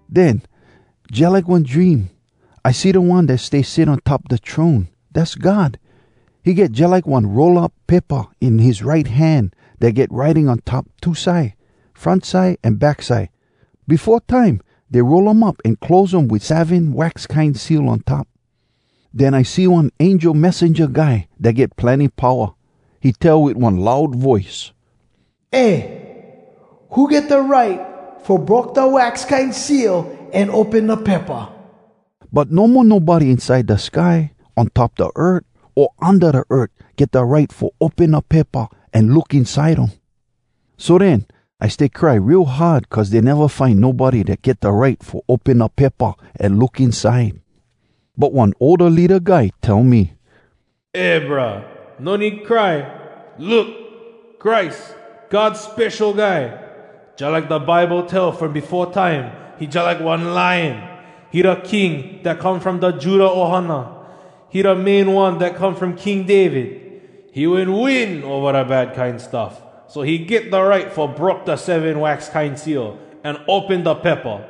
Den, jalike one dream, I see da One dat stay sit on top da throne, dass God. He get jalike one roll up paypa in his right hand dat get writing on top two side, front side an back side. Befo time dey roll um up an close um wit seven wax kine seal on top. Den I see one angel messenja guy dat get plenny powa. He tell wit one loud voice, “Eh! Who get da right fo broke da wax kine seal an open da paypa?” But no mo nobody inside da sky, on top da earth, o unda da earth get da right fo open da paypa an look inside um. So den, I stay cry real hard cuz dey neva find nobody dat get da right fo open da paypa an look inside. But one older leada guy tell me, “Eh, brah! No need cry! Look! Christ, God Spesho Guy! Jalike da Bible tell from befo time, he jalike one Lion! He da King dat come from da Judah ohana! He da Main One dat come from King David. He wen win ova da bad kine stuff, so he get da right fo broke da seven wax kine seal, an open da paypa!”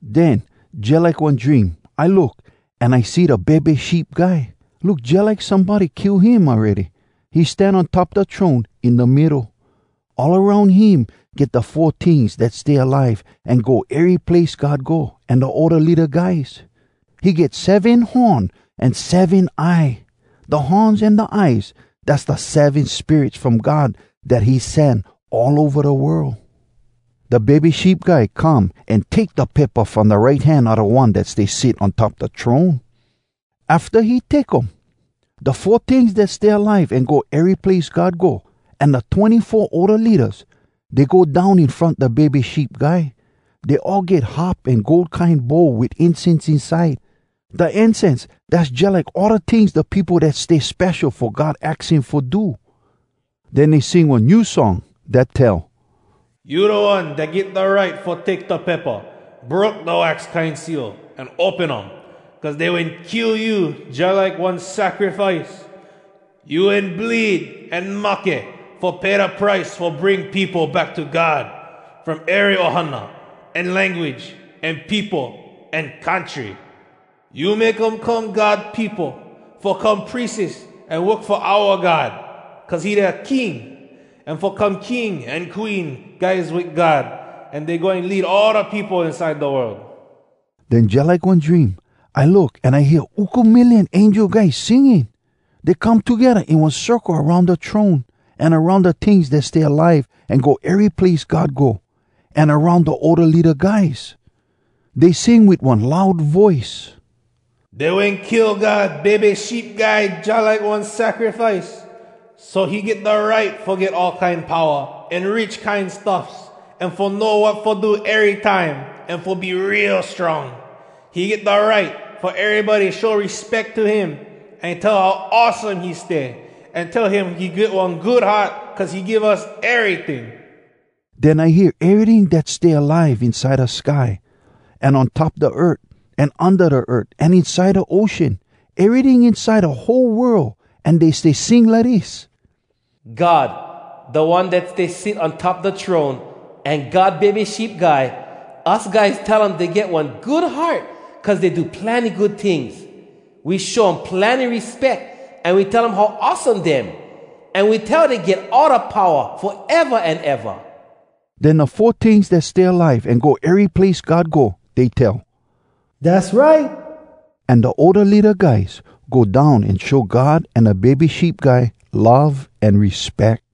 Den, jalike one dream, I look, an I see da Bebe Sheep Guy. Look jalike somebody kill him awready. He stan on top da throne, in da middo. All aroun him get da four tings dat stay alive an go ery place God go, an da older leada guys. He get seven horn an seven eye. Da horns an da eyes, dass da seven spirits from God dat he sen all ova da world. Da Bebe Sheep Guy come an take da paypa from da right hand a da One dat stay sit on top da throne. Afta he take um, da four tings dat stay alive an go ery place God go, an da twenny-four older leadas, dey go down in front da Bebe Sheep Guy. Dey all get harp an gold kine bowl wit incense inside. Da incense, dass jalike all da tings da peopo dat stay spesho fo God aks him fo do. Den dey sing one new song, dat tell: “You da One dat get da right Fo take da paypa, Broke da wax kine seal, An open um. Cuz dey wen kill you jalike one sacrifice. You wen bleed an mahke, Fo pay da price fo bring peopo back to God, From ery ohana, an language, an peopo, an country. You make um come God peopo, Fo come prieses an work fo oua God, cuz he dea King, An fo come king an queen guys wit God, An dey goin lead all da peopo inside da world.” Den jalike one dream, I look an I hear uku million angel guys singing! Dey come togedda in one circle aroun da throne, an aroun da tings dat stay alive an go ery place God go, an aroun da older leada guys. Dey sing wit one loud voice: “Dey wen kill God Bebe Sheep Guy Jalike one sacrifice. So he get da right fo get all kine powa, An rich kine stuffs, An fo know wat fo do erytime, An fo be real strong! He get da right fo erybody show respeck to him, An tell how awesome he stay, An tell him he get one good heart cuz he give us eryting!” Den I hear eryting dat stay alive inside da sky, an on top da earth, an unda da earth, an inside da ocean—eryting inside da whole world, an dey stay sing lidis: “God, da One dat stay sit on top da throne, An God Bebe Sheep Guy, Us guys tell um dey get one good heart Cuz dey do plenny good tings. We show um plenny respeck, An we tell how awesome dem, An we tell dey get all da powa, Foeva an eva!” Den da four tings dat stay alive an go ery place God go, dey tell, “Dass right!” An da older leada guys go down an show God an da Bebe Sheep Guy love an respeck.